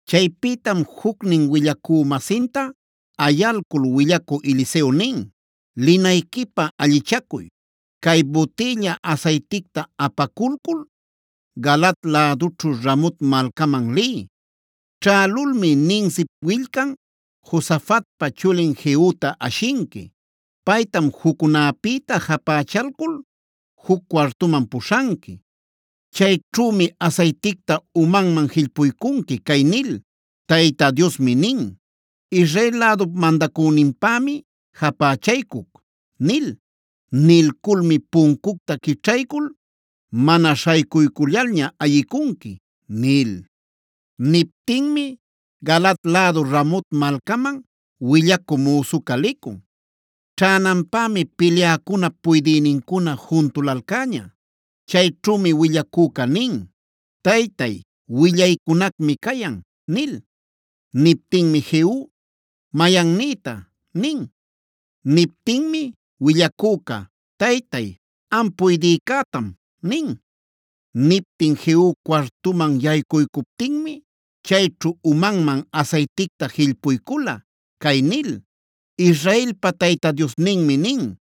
Chaypïtam jucnin willacü-masinta ayalcul willacü Eliseo nin: “Linayquipä allichacuy. Cay butïlla asayticta apaculcul Galaad lädućhu Ramot malcaman liy. Ćhälulmi Nimsip willcan, Josafatpa chulin Jehuta ashinqui. Paytam juccunäpïta japächalcul juc cuartuman puśhanqui. Chayćhümi asayticta umanman jillpuycunqui cay nil: ‘Tayta Diosmi nin: “Israel lädup mandacüninpämi japächaycuc” nil. Nilculmi puncucta quićhaycul mana śhaycuycullalña ayicunqui’” nil. Niptinmi Galaad lädu Ramot malcaman willacü müsuca licun. Ćhänanpämi pilyäcunap puydïnincuna juntulalcäña. Chayćhümi willacüca nin: “Taytay, willaycunacmi cayan” nil. Niptinmi Jehu: “¿Mayannïta?” nin. Niptinmi willacüca: “Taytay, am puydïcätam” nin. Niptin Jehu cuartuman yaycuycuptinmi chayćhu umanman asayticta jillpuycula cay nil: “Israelpa Tayta Diosninmi nin: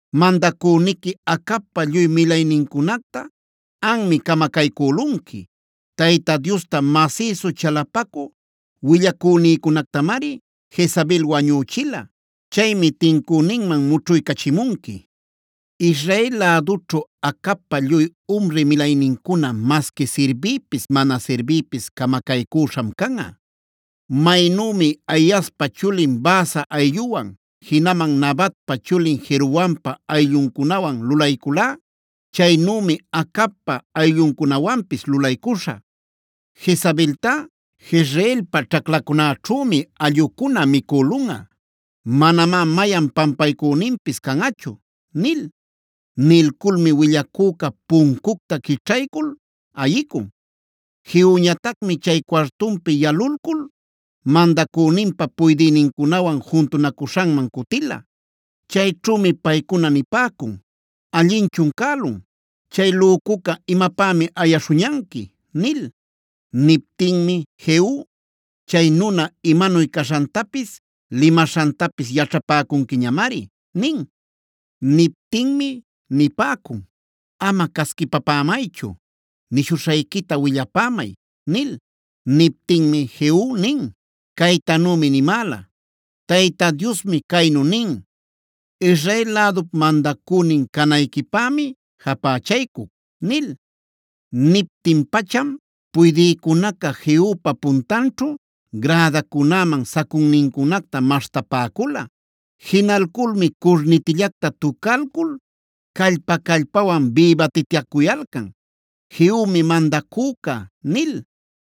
Mandacüniqui Acabpa lluy milaynincunacta anmi camacaycülunqui. Tayta Diosta masïsu chalapacü willacünïcunactamari Jezabel wañüchila. Chaymi tincüninman mućhuycachimunqui. Israel lädućhu Acabpa lluy umri milaynincuna masqui sirbïpis mana sirbïpis camacaycüśham canꞌa. Maynümi Ahiaspa chulin Baasa aylluwan, jinaman Nabatpa chulin Jeroboampa aylluncunawan lulayculá, chaynümi Acabpa aylluncunawanpis lulaycuśhä. Jezabeltá Jezreelpa ćhaclacunäćhümi allꞌucuna micülunꞌa. Manamá mayan pampaycüninpis canꞌachu’” nil.b Nilculmi willacüca puncucta quićhaycul ayicun. Jehuñatacmi chay cuartunpi yalulcul mandacüninpa puydïnincunawan juntunacuśhanman cutila. Chayćhümi paycuna nipäcun: “¿Allinchun cälun? ¿Chay lücuca imapämi ayaśhuñanqui?” nil. Niptinmi Jehu: “Chay nuna imanuy caśhantapis, limaśhantapis yaćhapäcunquiñamari” nin. Niptinmi nipäcun: “Ama casquipapämaychu. Nishuśhayquita willapämay” nil. Niptinmi Jehu nin: “Caytanümi nimäla: ‘Tayta Diosmi caynu nin: Israel lädup mandacünin canayquipämi japächaycuc’” nil. Niptin-pacham puydïcunaca Jehupa puntanćhu gradacunäman sacunnincunacta maśhtapäcula. Jinalculmi curnitillacta tucalcul callpa-callpawan bïbatityacuyalcan: “Jehumi mandacüca” nil.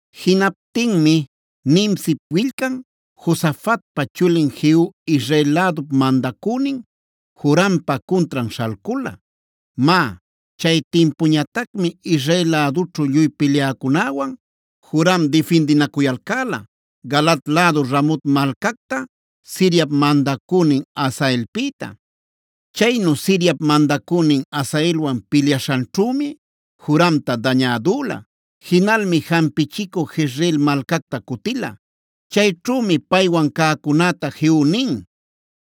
Jinaptinmi Nimsip willcan, Josafatpa chulin Jehu Israel lädup mandacünin Jorampa cuntran śhalcula. (Má, chay timpuñatacmi Israel lädućhu lluy pilyäcunäwan Joram difindinacuyalcäla Galaad lädu Ramot malcacta Siriap mandacünin Hazaelpïta. Chaynu Siriap mandacünin Hazaelwan pilyaśhanćhümi Joramta dañädüla. Jinalmi jampichicü Jezreel malcacta cutila.) Chayćhümi paywan cäcunäta Jehu nin: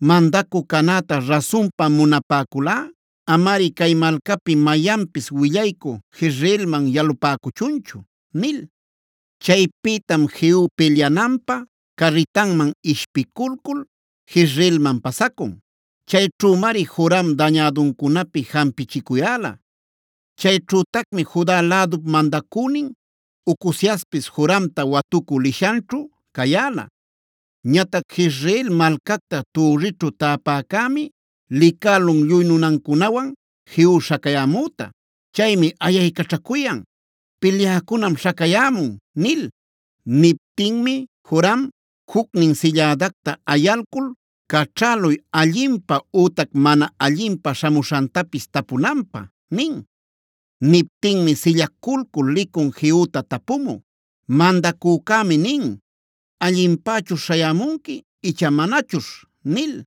“Mandacü canäta rasunpa munapäculꞌa amari cay malcapi mayanpis willaycü Jezreelman yalupäcuchunchu” nil. Chaypïtam Jehu pilyananpä carritanman ishpiculcul Jezreelman pasacun. Chayćhümari Joram dañäduncunapi jampichicuyäla. Chayćhütacmi Juda lädup mandacünin Ocoziaspis Joramta watucü lishanćhu cayäla. Ñatac Jezreel malcacta türrićhu täpäcämi licälun lluy nunancunawan Jehu śhacayämüta. Chaymi ayaycaćhacuyan: “Pilyäcunam śhacayämun” nil. Niptinmi Joram: “Jucnin sillädacta ayalcul caćhäluy allinpä ütac mana allinpä śhamuśhantapis tapumunanpä” nin. Niptinmi sillaculcul licun Jehuta tapumü: “Mandacücämi nin: ‘¿Allinpächuśh śhayämunqui icha manachuśh?’” nil.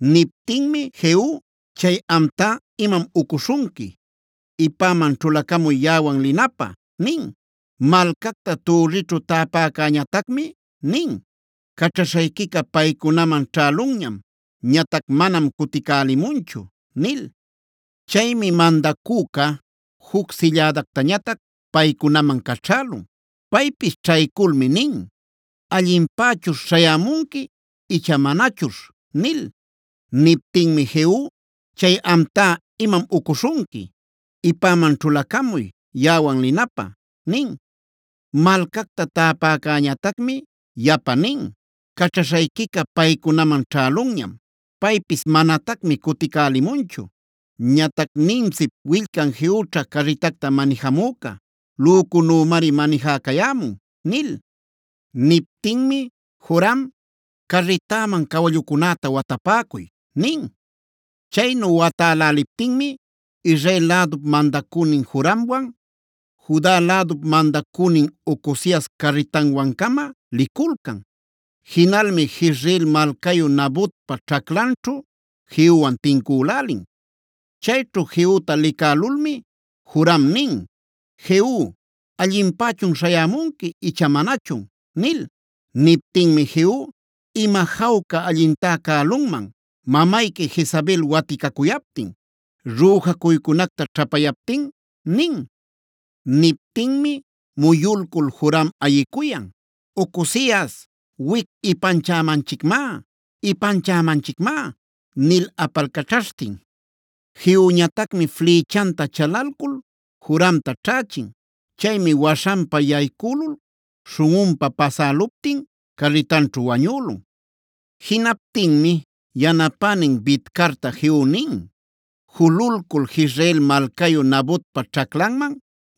Niptinmi Jehu: “Chay amtá ¡imam ucuśhunqui! Ipäman ćhulacamuy yaꞌawan linapä” nin. Malcacta türrićhu täpäcäñatacmi nin: “Caćhaśhayquica paycunaman ćhälunñam. Ñatac manam cuticälimunchu” nil. Chaymi mandacüca juc sillädactañatac paycunaman caćhälun. Paypis ćhayculmi nin: “¿Allinpächuśh śhayämunqui icha manachuśh?” nil. Niptinmi Jehu: “Chay amtá ¡imam ucuśhunqui! Ipäman ćhulacamuy yaꞌawan linapä” nin. Malcacta täpäcäñatacmi yapa nin: “Caćhaśhayquica paycunaman ćhälunñam. Paypis manatacmi cuticälimunchu. Ñatac Nimsip willcan Jehućha carritacta manijamüca; lücunümari manijäcayämun” nil. Niptinmi Joram: “Carritäman cawallucunäta watapäcuy” nin. Chaynu watäläliptinmi Israel lädup mandacünin Joramwan Juda lädup mandacünin Ocozias carritanwan-cama liculcan. Jinalmi Jezreel malcayu Nabotpa ćhaclanćhu Jehuwan tincülälin. Chayćhu Jehuta licälulmi Joram nin: “Jehu, ¿allinpächun śhayämunqui icha manachun?” nil. Niptinmi Jehu: “¿Ima jawca allintá cälunman mamayqui Jezabel waticacuyaptin, rüjacuycunacta ćhapayaptin?” nin. Niptinmi muyulcul Joram ayicuyan: “Ocozias, wic ¡ipanchämanchicmá! ¡ipanchämanchicmá!” nil apalcaćhaśhtin. Jehuñatacmi flïchanta chalalcul Joramta ćhächin. Chaymi waśhanpa yaycülul śhunꞌunpa pasäluptin carritanćhu wañülun. Jinaptinmi yanapänin Bidcarta Jehu nin: “Jululcul Jezreel malcayu Nabotpa ćhaclanman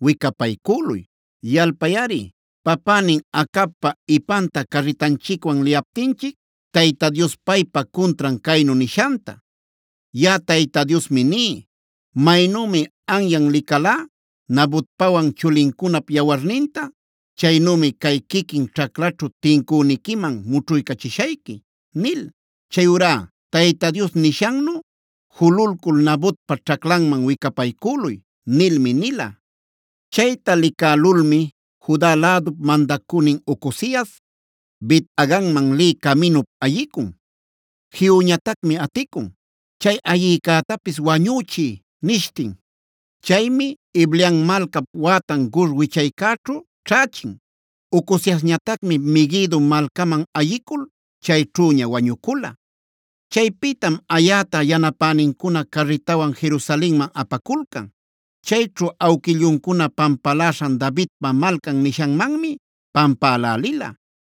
wicapaycüluy. Yalpayꞌari papänin Acabpa ipanta carritanchicwan liyaptinchic Tayta Dios paypa cuntran caynu nishanta: ‘Yaꞌa Tayta Diosmi ní: maynümi anyan licalá Nabotpawan chulincunap yawarninta, chaynümi cay quiquin ćhaclaćhu tincüniquiman mućhuycachishayqui’ nil.c Chayurá Tayta Dios nishannu jululcul Nabotpa ćhaclanman wicapaycüluy” nilmi nila. Chayta licälulmi Juda lädup mandacünin Ocozias Bet-haganman lï caminup ayicun. Jehuñatacmi aticun: “Chay ayicätapis wañüchiy” nishtin. Chaymi Ibleam malcap wätan Gur wichaycäćhu ćhächin. Ocoziasñatacmi Meguido malcaman ayicul chayćhüña wañucula. Chaypïtam ayäta yanapänincuna carritawan Jerusalenman apaculcan. Chayćhu awquilluncuna pampaläśhan Davidpa Malcan nishanmanmi pampälälila.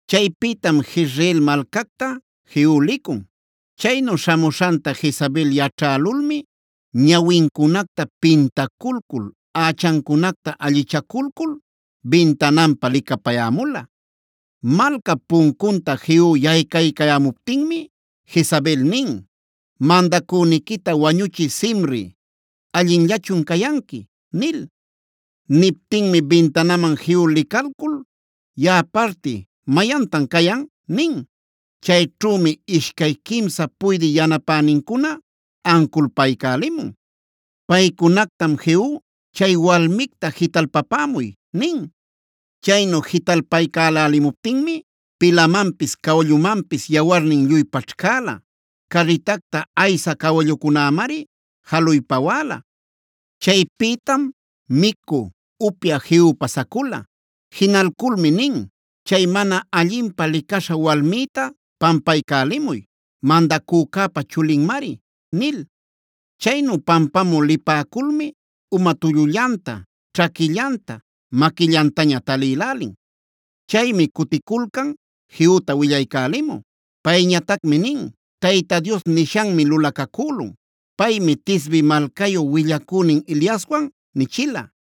Chaypïtam Jezreel malcacta Jehu licun. Chaynu śhamuśhanta Jezabel yaćhälulmi ñawincunacta pintaculcul, ächancunacta allichaculcul bintananpa licapayämula. Malcap puncunta Jehu yaycaycayämuptinmi Jezabel nin: “Mandacüniquita wañuchï Zimri,d ¿allinllachun cayanqui?” nil. Niptinmi bintanaman Jehu licalcul: “Yaꞌa parti ¿mayantan cayan?” nin. Chayćhümi ishcay quimsa puydï yanapänincuna anculpaycälimun. Paycunactam Jehu: “Chay walmicta jitalpapämuy” nin. Chaynu jitalpaycälälimuptinmi pilamanpis cawallumanpis yawarnin lluy paćhcäla. Carritacta aysä cawallucunämari jaluy pawäla. Chaypïtam micü, upyä Jehu pasacula. Jinalculmi nin: “Chay mana allinpä licaśha walmïta pampaycälimuy; mandacücäpa chulinmari” nil. Chaynu pampamü lipäculmi uma tullullanta, ćhaquillanta, maquillantaña talïlälin. Chaymi cuticulcan Jehuta willaycälimü. Payñatacmi nin: “Tayta Dios nishanmi lulacacülun. Paymi Tisbe malcayu willacünin Eliaswan nichila: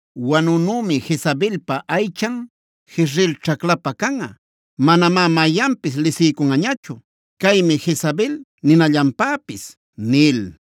Wanunümi Jezabelpa aychan Jezreel ćhaclapä canꞌa. Manamá mayanpis lisiycunꞌañachu: “Caymi Jezabel” ninallanpäpis’” nil.